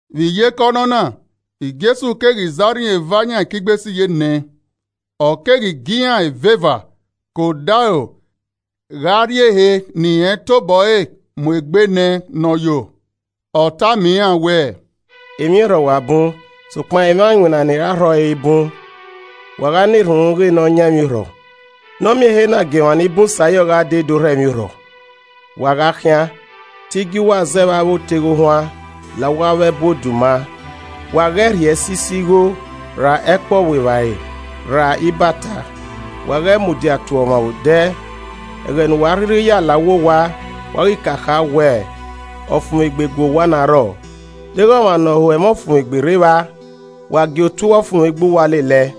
Vbe iyeke ọnọna, Jesu keghi zẹ arhin eva yan ekigbesiyenẹ, ọ keghi gie iran eveva ke odaro gha rrie ehe ne irẹn tobọ ẹre mu egbe nẹ ne ọ yo. Ọ tama iran wẹẹ, “Emwiorhọ wa bun sokpan emwa iwinna ni ra rhọ ẹre i bun. Wa gha na erhunmwu ghe ne ọ yan emwiorhọ ne ọ miẹn ehe na gie emwa ni bun sa yọ gha dee do rhọ emwiorhọ. Wa gha khian. Te I gie uwa zẹ vbe avbe oteghe ohuan la uwa ẹbu avbe oduma. Wa ghẹ rhie ẹsiso igho, ra ẹkpo ọvbuevbare, ra ibata, wa ghẹ mudia tuẹ ọmwa vbe odẹ. Ẹghẹ ne uwa a rhirhi ya la uwu owa, wa ghi ka kha wẹẹ, ‘Ọfumwegbe gu owa na rrọọ.’ Deghẹ ọmwa ne ọ ho ẹmwẹ ọfumwegbe rre evba, wa gie otuẹ ọfumwegbe uwa lele ẹe,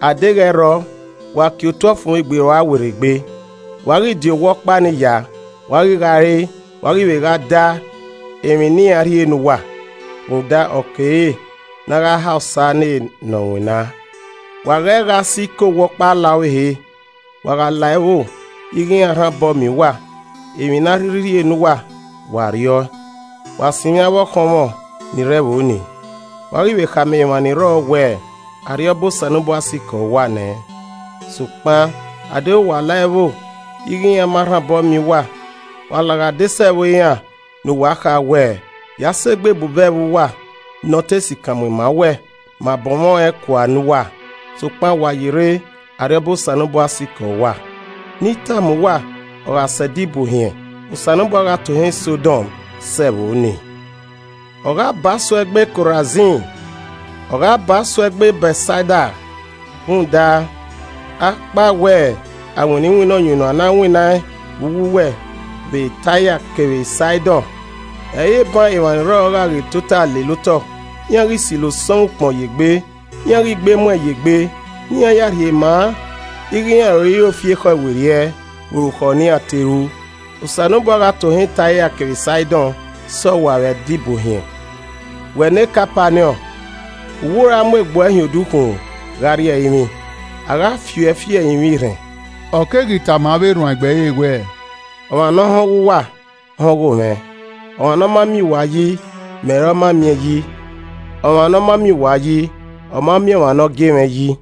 a deghẹ ẹ i rrọọ, wa kie otuẹ ọfumwegbe rua werriegbe. Wa ghi di owa ọkpa ni ya, wa ghi gha re, wa ghi vbe gha da emwi ne iran rhie ne uwa, rhunmwuda ọ kere ne a gha ha osa ne ne ọ winna. Wa ghẹ gha si ke owa ọkpa la ọvbehe. Wa gha la ẹvbo ighe iran rhan obọ miẹn uwa, emwi ne a rhirhi rhie ne uwa, wa rriọe. Wa sinmwi avbe ọkhọnmwẹ ni rre ẹvbo nii, wa ghi vbe khama emwa ni rrọọ wẹẹ, ‘Arriọba Osanobua sikẹ uwa nẹ.’ Sokpan adeghẹ uwa la ẹvbo ighe iran ma rhan obọ miẹn uwa, wa laghe adesẹ ẹvbo iran ne uwa kha wẹẹ, ‘Ya sẹ egbe ebubẹ ẹvbo uwa ne ọ te sikan mu ima owẹ, ma bọnmwẹ ọẹn kua ne uwa, sokpan wa yerre, Arriọba Osanobua sikẹ uwa!’ Ne I tama uwa, ọ gha sẹ Ẹdẹ Ibuohiẹn Osanobua gha tohan Sọdom sẹ ẹvbo nii! “Ọ gha ba suẹ gbe Korazin! Ọ gha ba suẹ gbe Bẹtsaida! Rhunmwuda, akpawẹ a winna iwinna ọyunnuan ne a winnaẹn vbe uwu uwẹ vbe Taia kevbe Saidọn, ẹ i re eban emwa ni rrọọ gha ghi tota lele otọ, iran ghi silo osọnmwẹ ukpọn ye egbe, iran ghi gbe emuẹn ye egbe, ne iran ya rhie ma ighe iran roiro fi ekhọe werriẹ vbe orukhọ ne iran te ru. Osanobua gha tohan Taia kevbe Saidọn sẹ uwa vbe Ẹdẹ Ibuohiẹn. Wẹ ne Kapaniọn. U wẹ u ra mu egbe uẹ hin odukhunmwu gha rrie ẹrinmwi? A gha fi uẹ fi ẹrinmwi erhẹn.” Ọ keghi tama avbe erhuanegbe ẹre wẹẹ, “Ọmwa ne ọ họn ọghe uwa, họn ọghomwẹ. Ọmwa ne ọ ma miẹn uwa yi, mẹ ọre ọ ma miẹn yi, ọmwa ne ọ ma miẹn uwa yi, ọ ma miẹn ọmwa ne ọ gie mwẹ yi.”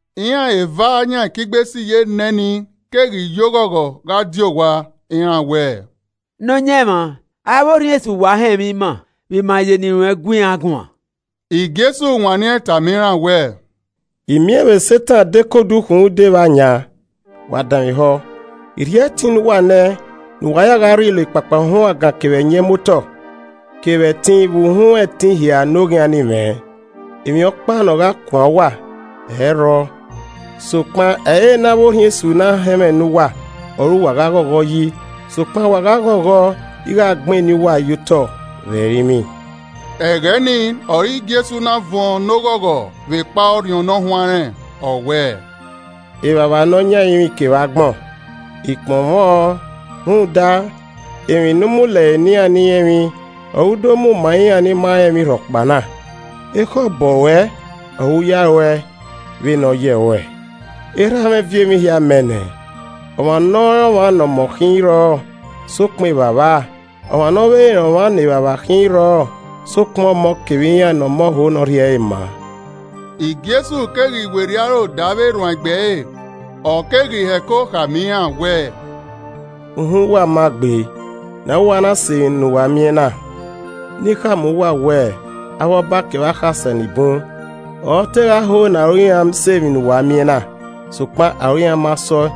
Iran eva yan ekigbesiyenẹ nii keghi ye oghọghọ gha die owa. Iran wẹẹ, “Nọyaẹnmwa, avbe orhiọn esu wa họn ẹmwẹ ima vbe ima ye eni ruẹn gu iran guan!” Jesu wanniẹn tama iran wẹẹ, “I miẹn vbe Setan de ke odukhunmwu dee vbe ayan. Wa danmwehọ, I rhie ẹtin ne uwa nẹ ne uwa ya gha rrilo ekpakpahuangan kevbe ẹyẹn muotọ, kevbe ẹtin vbe uhunmwu ẹtin hia ne Oghian ni mwẹ. Emwi ọkpa ne ọ gha kuan uwa, ẹ i rrọọ. Sokpan ẹ i re ne avbe orhiọn esu na họn ẹmwẹ ne uwa ọre uwa gha ghọghọ yi, sokpan wa gha ghọghọ ighe a gbennẹ eni uwa ye otọ vbe ẹrinmwi.” Ẹghẹ ni ọre Jesu na vuọn ne oghọghọ vbekpa Orhiọn Ne ọ huanrẹn, ọ wẹẹ, “Evbavba Nọyan ẹrinmwi kevbe agbọn, I kpọnmwẹ ọn rhunmwuda, emwi ne u mu lẹre ne iran ni rẹn emwi, ọre u do mu ma iran ni ma rẹn emwi rhọkpa na. Ekhọe obọ ruẹ Ọre u ya ru ẹe vbe ne ọ yẹ ruẹ. “Erha mwẹ viọ emwi hia mẹ nẹ. Ọmwa ne ọ rẹn ọmwa ne ọmọ khin i rrọọ, sokpan Evbavba, ọmwa ne ọ vbe rẹn ọmwa ne Evbavba khin ẹ i rrọọ, sokpan Ọmọ kevbe iran ne Ọmọ ho ne ọ rhie ẹre maa.” Jesu keghi werriẹ aro da avbe erhuanegbe ẹre, ọ keghi heko khama iran wẹẹ, “Uhunmwu uwa ma gbe ne aro uwa na sẹ emwi ne uwa miẹn na. Ne I khama uwa wẹẹ avbe Ọba kevbe akhasẹ ni bun ọre ọ te gha ho ne aro iran sẹ emwi ne uwa miẹn na, sokpan aro iran ma se ọe,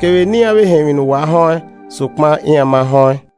kevbe ne iran vbe họn emwi ne uwa họn ẹn, sokpan iran ma họn ẹn.”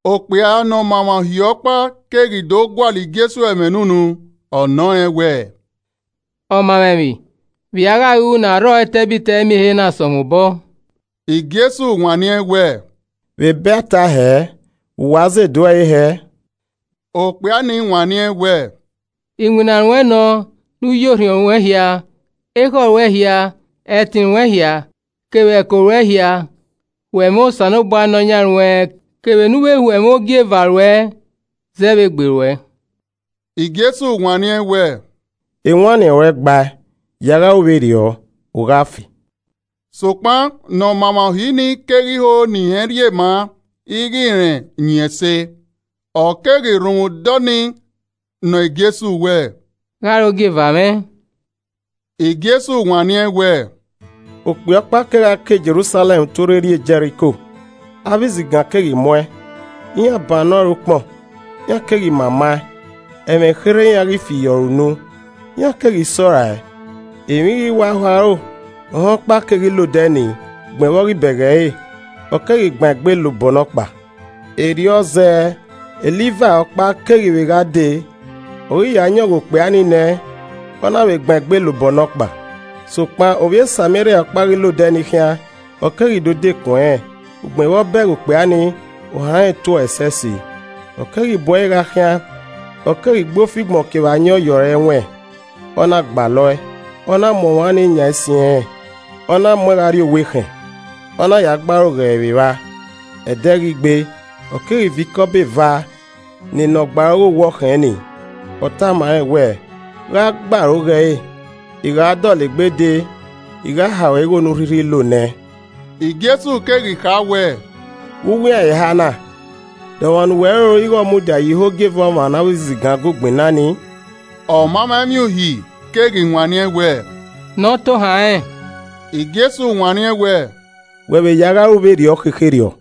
Okpia ne ọ ma emwa Uhi ọkpa keghi do gualọ Jesu ẹmwẹ ne unu, ọ nọ rẹn wẹ, “Ọmamwaemwi, vbe i a gha ru ne a rrọọ etẹbitẹ miẹn ehe na sẹ mwẹ obọ?” Jesu wanniẹn wẹẹ, “Vbe Ebe a ta ẹe hẹẹ? Vbe uwẹ a zẹ edu ẹre hẹẹ?” Okpia ni wanniẹn wẹẹ, “Iwinna ruẹ nọ ne u ye orhiọn ruẹn hia, ekhọe ruẹ hia, ẹtin ruẹn hia kevbe ẹko ruẹ hia ho ẹmwẹ Osanobua Nọyan ruẹn kevbe ne u vbe ho ẹmwẹ ogieva ruẹ zẹ vbe egbe ruẹ.” Jesu wanniẹn wẹẹ, “Ewanniẹn ruẹn gbae, ya gha ru vberriọ, u gha fe.” Sokpan ne ọmaemwa uhi ni keghi ho ne irẹn rhie maa ighẹ rẹn yin ẹse, ọ keghi rhunmwuda ọnii nọ Jesu wẹẹ, “Gha ọre ogieva mwẹ?” Jesu wanniẹn wẹẹ, “Okpia ọkpa kegha ke Jerusalẹm tuorre rrie Jẹriko, avbe izigan keghi mu ẹn, iran bannọ ẹre ukpọn, iran keghi mama ẹn, ẹmwẹ kherhe iran ghi fi ye ọre unu, iran keghi sẹ ọe rae. Emwi ghi wa ho aro, ohẹn ọkpa keghi la odẹ ni, ugbẹn vbe ọ ghi bẹghe ẹre, ọ keghi gban egbe la obọ nọkpa. Erriọ zẹẹ, e Livai ọkpa keghi vbe gha dee, ọ ghi ya yọn ghe okpia ni nẹ, ọ na vbe gban egbe la obọ nọkpa. Sokpan ovbi e Sameria ọkpa ghi la odẹ nii khian, ọ keghi do dekun ẹnrẹn, ugbẹn vbe ọ bẹghe okpia nii, ohan rẹn to ẹe ẹsẹse. Ọ keghi bu ẹre gha khian, ọ keghi gbe ofigbọn kevbe ayọn ye ọre ẹwẹn, ọ na gbalọe, ọ na mu ọmwa nii yan ẹsin ẹnrẹn, ọ na mu ẹn gha rrie owa ekhẹn, ọ na ya gbe aro ghe ẹre vbe evba. Ẹdẹ ghi gbee, ọ keghi viọ ikọbọ eva ne ne ọ gbe aro ghe owa ekhẹn ni. Ọ tama rẹn wẹẹ, ‘Gha gbe aro ghe ẹre, I gha dọlegbe dee, I gha ha ruẹ igho ne u rhirhi lo nẹẹn.’” Jesu keghi kha wẹẹ, “Vbe uwu iran eha na, de ọmwa ne uwẹ roro ighẹ ọ mudia ye ihe ogieva ọmwa ne avbe izigan gu gbinna ni?” Ọmamwaemwi uhi keghi wanniẹn wẹẹ, “Ne ọ tohan rẹn.” Jesu wanniẹn wẹẹ, “Wẹ vbe ya gha ru vberriọ khekherriọ.”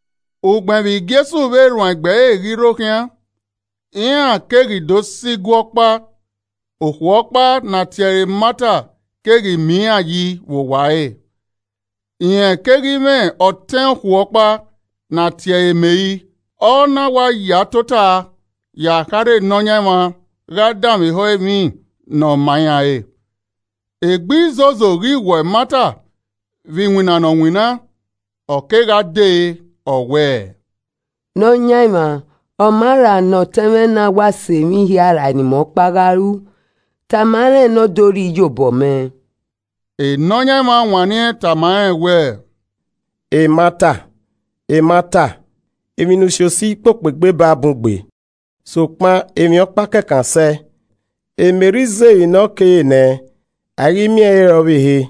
Ugbẹn vbe Jesu vbe erhuanegbe ẹre ghi rre okhian, iran keghi do sẹ igue ọkpa, okhuo ọkpa ne a tie ẹre Mata keghi miẹn iran yi vbe owa ẹre. Rẹn keghi mwẹ ọtẹn okhuo ọkpa ne a tie ẹre Meri, ọ na wa ya tota ye akharha Nọyaẹnmwa gha danmwehọ emwi ne ọ ma iran re. Egbe izozo ghi wọ Mata vbe iwinna ne ọ winna, ọ kegha dee, ọ wẹẹ, “Nọyaẹnmwa, ọ maa ra ne ọtẹn mwẹ na wa sẹ emwi hia rae ne imẹ ọkpa gha ru? Tama rẹn ne ọ do rhie iyobọ mẹ.” Nọyaẹnmwa wanniẹn tama rẹn wẹẹ. “Mata, Mata, emwi ne u si osi kpokpo egbe baa bun gbe. Sokpan emwi ọkpa kẹkan sẹe, Meri zẹ emwi ne ọ kere nẹ, a i ghi miẹn ẹre re ọvbehe.”